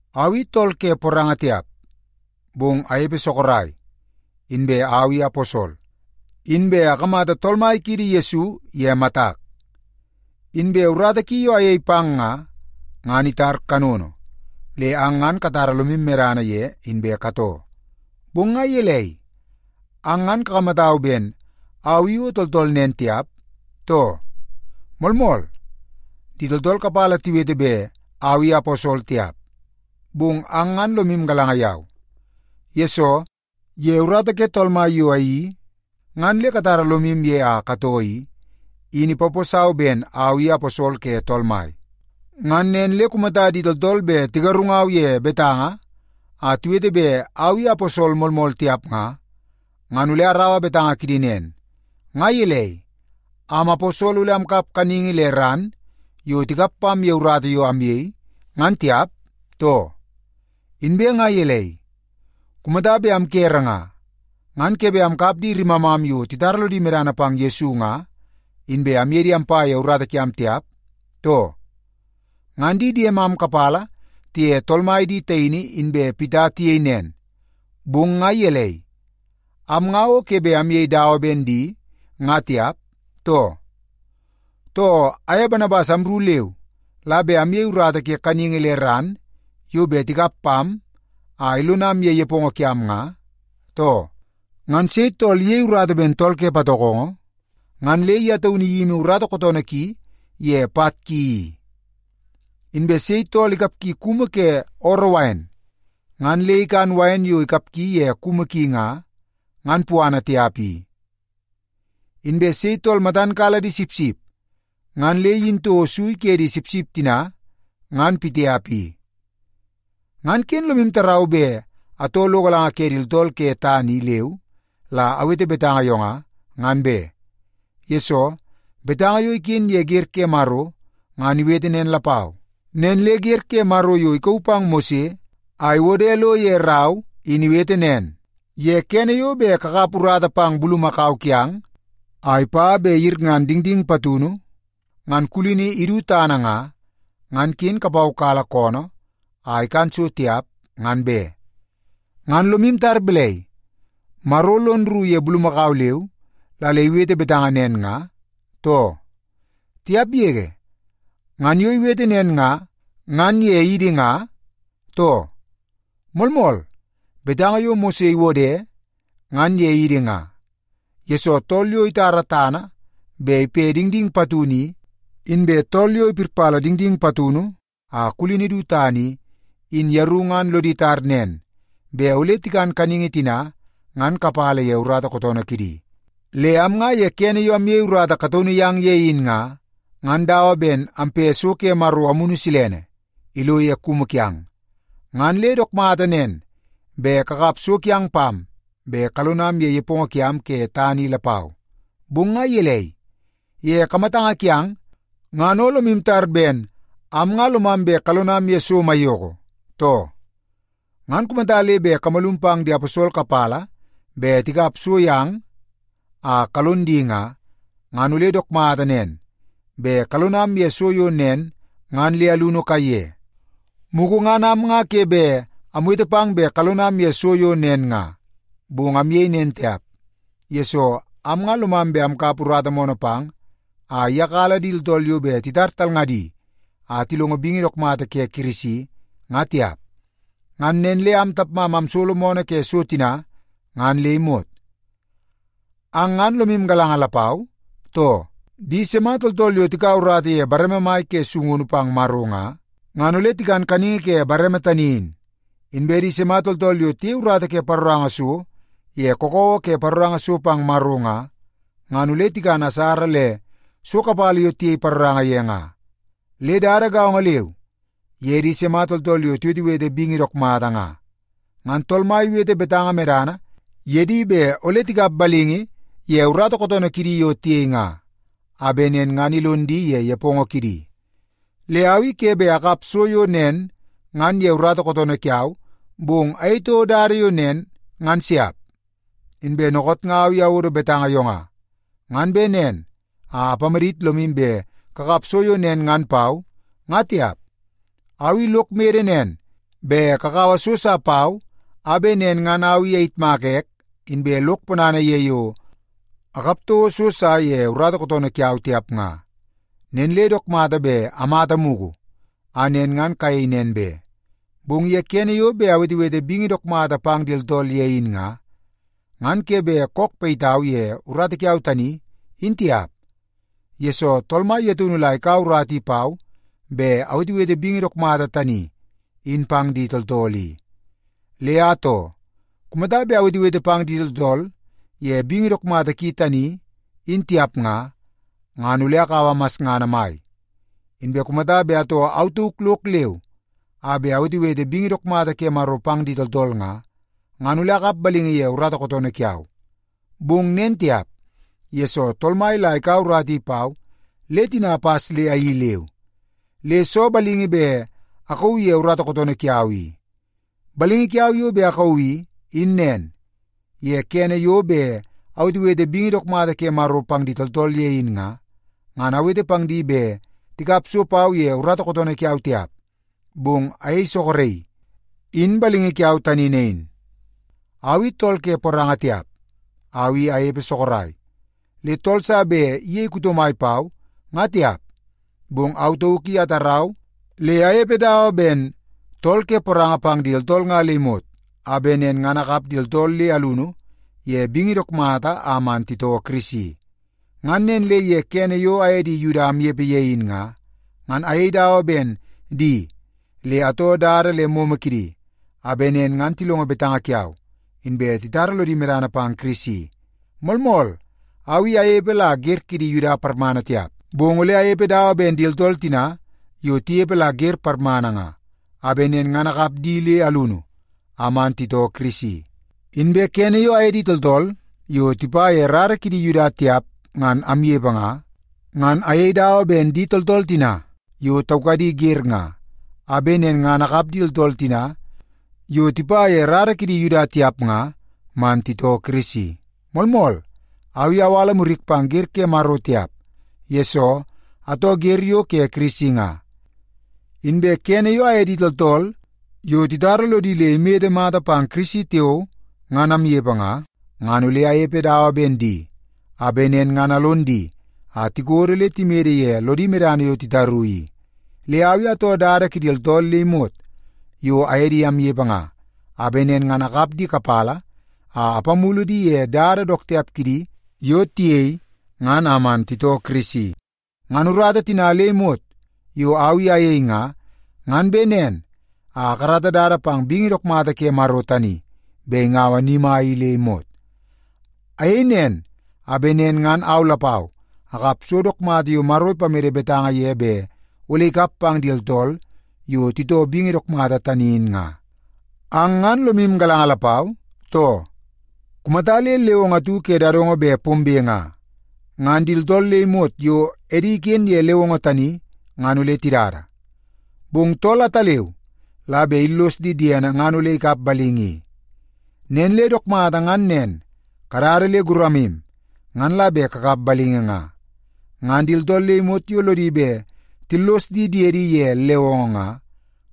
Au i tool ke poranga tiap, bong anepe sorok. Inbe au i aposol. Inbe akamata Tool Mai kiidi Yesu ye matak. Inbe urata ki yo ayei pang nga, ngan itar kanono, le ang ngan katara lomu ye inbe katoo. Bong nga gelei, ang ngan kakamatau ben au i o tooltool nen tiap, too? Moolmool, di tooltool kapala tiwete bet au i aposol tiap, bong ang ngan lomu galanga yau. Yesoo, ye urata ke Tool Mai yo ayeii ngan le katara lomu ye a katoo i, in ipaposau ben au i aposol ke Tool Mai. Ngan nen le kumata di tooltool bet tigarungau ye betanga a tiwete bet au i aposol moolmool tiap nga, ngan ole araua betanga kidi nen. Nga gelei, am aposol ole amkap kaningi le ran yo tikap pam ye urata yo amyei, ngan tiap, too? Inbe nga gelei, kumata bet amkere nga, ngan ke bet amkap di rimamam yo titara lodi medana pang Yesu nga, inbe amye di ampa ye urata kiam tiap, too? Ngan di diemam kapala tiye Tool Mai di taini inbe Pita tiyei nen, bong nga gelei, am nga o ke bet amyei dawa ben di nga tiap, too? Too, aye Banabas amru leu la bet amyei urata ye kaningi le ran yo bet tikap pam a ilonam ye nepongo kiam nga, too? Ngan sei tool iyei urata ben tool ke patokongo, ngan le ye taunu iyimi urata kootoonoo ki ye pat ki i? Inbe sei tool ikapgi kumu ke ooroo wain, ngan le ikan wain yo ikapgi ye kumu ki nga, ngan puana tiap i? Inbe sei tool matan kala di sipsip, ngan le iyin toko sui ke di sipsip tina ngan pitiap i? Ngan ken lomu tarau bet atoo lo galanga ke di tooltool ke tana i leu la awete betanga yo nga, ngan be. Yesoo, betanga yo iken ye wer ke Maro ngan iwete nen lapau. Nen le wer ke Maro yo ikauu pang Mose a iwode lo ye rau in iwete nen, “Ye kene yo bet kakap urata pang bulumakau kiang a ipa bet iyirngan dingding patunu ngan kulini idu tana nga, ngan ken kupaukala koonoo a ikan so tiap ngan be.” Ngan lomu tar balai, Maro lon rru ye bulumakau leu la le iwete betanga nen nga, too? Tiap yege! Ngan yo iwete nen nga, ngan ye idi nga, too? Moolmool, betanga yo Mose iwode in ye idi nga. Yesoo, tool yo itara tana bet ipe dingding patunu i, inbe tool yo ipirpala dingding patunu a kulini du tana i, in yeru ngan lodi tar nen bet ole tikan kaningi tina ngan kapala ye urata kootoonoo kidi. Le am nga ye kene yo amyei urata kataunu yang ye in nga, ngan dawa ben ampe so ke Maro Amunu Silene ilo ye kumu kiang, ngan le dook mata nen bet kakap so kiang pam bet kalonam ye nepongo kiam ke tana i lapau. Bong nga gelei, ye kamatanga kiang ngan o lomu tar ben am nga lomam bet kalonam ye so maiyoko, too? Ngan kumata le bet kamalum pang di aposol kapala bet tikap so yang a kalon di nga, ngan ole dook mata nen bet kalonam ye so yo nen ngan le alunu kaiye. Mugu ngan am nga ke bet amwete pang bet kalonam ye so yo nen nga, bong amyei nen tiap, yesoo am nga lomam bet amkap urata moonoo pang a iyakala di tooltool yo bet titar talngadi a tilongo bingi dook mata ke Kirisi nga tiap. Ngan nen le am tapmam amsolo moonoo ke so tina ngan le imot. Ang ngan lomu galanga lapau, too? Di sima tooltool yo tikaua urata ye bareme mai ke sungunu pang Maro nga, ngan ole tikan kaningi ke bareme tani in. Inbe di sima tooltool yo tiyei urata ke paroranga so ye kakawa ke paroranga so pang Maro nga, ngan ole tikan asara le so kapala yo tiyei paroranga ye nga. Le dada gaongo leu ye di sima tooltool yo tiwetewete bingi dook mata nga. Ngan Tool Mai iwete betanga medana ye di bet ole tikap balingi ye urata kootoonoo kidi yo tiyei nga, a bet nen ngan ilon di ye nepongo kidi. Le au i ke bet akap so yo nen ngan ye urata kootoonoo kiau, bong ayei toko dada yo nen ngan siap. Inbe dookoot nga au i awodo betanga yo nga, ngan bet nen a apamadit lomu bet kakap so yo nen ngan pau, ngan tiap. Au i lok mede nen bet kakaua so sa pau be, a bet nen ngan au i ayitmaka ek inbe lok ponana ye yo akap toko so sa ye urata kootoonoo kiau tiap nga. Nen le dook mata bet amata mugu a nen ngan kayei nen be. Bong ye kene yo bet awetewete bingi dook mata pang di tooltool ye in nga, ngan ke bet kook payitau ye urata kiau tani, in tiap. Yesoo, Tool Mai ye taunu la ikaua urata i pau bet awetewete bingi dook mata tani in pang di tooltool i. Le atoo, kumata bet awetewete pang di tooltool ye bingi dook mata ki tani in tiap nga, ngan ole akaua masngana mai. Inbe kumata bet atoo au tauk lok leu a bet awetewete bingi dook mata ke Maro pang di tooltool nga, ngan ole akap balingi ye urata kootoonoo kiau. Bong nen tiap, yesoo Tool Mai la ikaua urata i pau le tina apas le ayeii leu. Le soo balingi bet akauu ye urata kootoonoo kiau i? Balingi kiau yo bet akauu i, in nen. Ye kene yo bet awetewete bingi dook mata ke Maro pang di tooltool ye in nga, ngan awete pang di bet tikap so pau ye urata kootoonoo kiau tiap, bong ayei soroki. In balingi kiau tani nain. Au i tool ke poranga tiap, au i anepe sorok, le tool sa bet iyei kuto mai pau, ngan tiap. Bong au tauk i atarau le anepe dawa ben tool ke poranga pang di tooltool nga le imot, a bet nen ngan akap di tooltool le alunu ye bingi dook mata a man titoo Kirisi. Ngan nen le ye kene yo aye di Yuda amnepe ye in nga, ngan ayei dawa ben di le atoo dada le momo kidi, a bet nen ngan tilongo betanga kiau, inbe titara lodi medana pang Kirisi. Moolmool, au i anepe la wer kidi Yuda parmana tiap, bong ole anepe dawa ben di tooltool tina yo tinepe la wer parmana nga, a bet nen ngan akap di le alunu a man titoo Kirisi. Inbe kene yo aye di tooltool yo tipa ye rara ke di Yuda tiap ngan amnepe nga, ngan ayei dawa ben di tooltool tina yo taukadi wer nga, a bet nen ngan akap di tooltool tina yo tipa ye rara kidi Yuda tiap nga man titoo Kirisi. Moolmool, au i awala murik pang wer ke Maro tiap, yesoo atoo wer yo ke Kirisi nga. Inbe kene yo aye di tooltool yo titara lodi le imede mata pang Kirisi tiao ngan amnepe nga, ngan ole anepe dawa ben di, a bet nen ngan alon di a tikodo le timede ye lodi medana yo titaru i. Le au i atoo dada kidi tooltool le imot yo aye di amnepe nga, a bet nen ngan akap di kapala a apamulu di ye dada dook tiap kidi yo tiyei ngan a man titoo Kirisi. Ngan urata tina le imot yo au i ayei nga, ngan bet nen a akarata dada pang bingi dook mata ke Maro tani bet ingaua ni mai i le imot. Ayei nen, a bet nen ngan au lapau akap so dook mata yo Maro ipamede betanga ye bet ole ikap pang di tooltool yo titoo bingi dook mata tani in nga. Ang ngan lomu galanga lapau, too? Kumata le lewongo atu ke dadongo bet pombe nga, ngan di tooltool le imot yo edi iken ye lewongo tani ngan ole tidada. Bong tool ataleu la bet illos di diene ngan ole ikap balingi i. Nen le dook mata ngan nen, kadada le guramu ngan la bet kakap balingi nga. Ngan di tooltool le imot yo lodi bet tillos di diedi ye lewongo nga,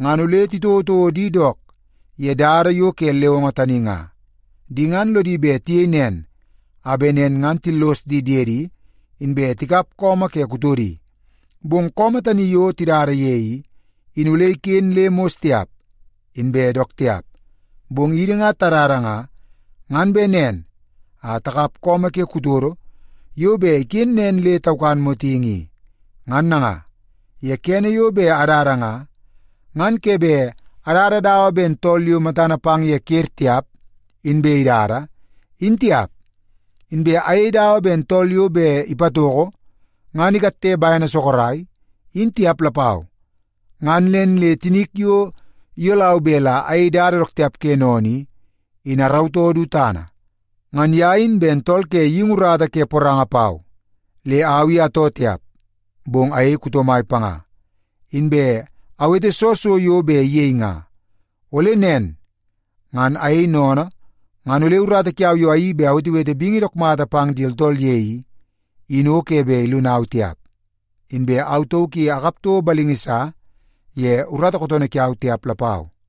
ngan ole titouotouo di dook ye dada yo ke lewongo tani nga. Di ngan lodi bet tiyei nen, a bet nen ngan tillos di diedi inbe tikap su ke kutodi. Bong su tani yo tidada ye i, in ole iken le mos tiap inbe dook tiap. Bong idi nga tadada nga, ngan bet nen a takap su ke kutodo yo bet iken nen le taukan motingi i. Ngan nanga, ye kene yo bet adada nga, ngan ke bet adada dawa ben tool yo matana pang ye ker tiap inbe idada, in tiap. Inbe ayei dawa ben tool yo bet ipatoko ngan ikatte bene sorok, in tiap lapau. Ngan nen le tinik yo iyolau bet la ayei dada dook tiap ke sennene i, in arautoo du tana. Ngan ye in ben tool ke geingi urata ke poranga pau le au i atoo tiap, bong ayei kuto mai panga, inbe awete soo so yo bet iyei nga. Ole nen ngan ayei sennene ngan ole urata yo ayeii bet awetewete bingi dook mata pang di tooltool ye i, in o ke bet ilonau tiap, inbe au tauk i akap toko balingi sa ye urata kootoonoo kiau tiap lapau.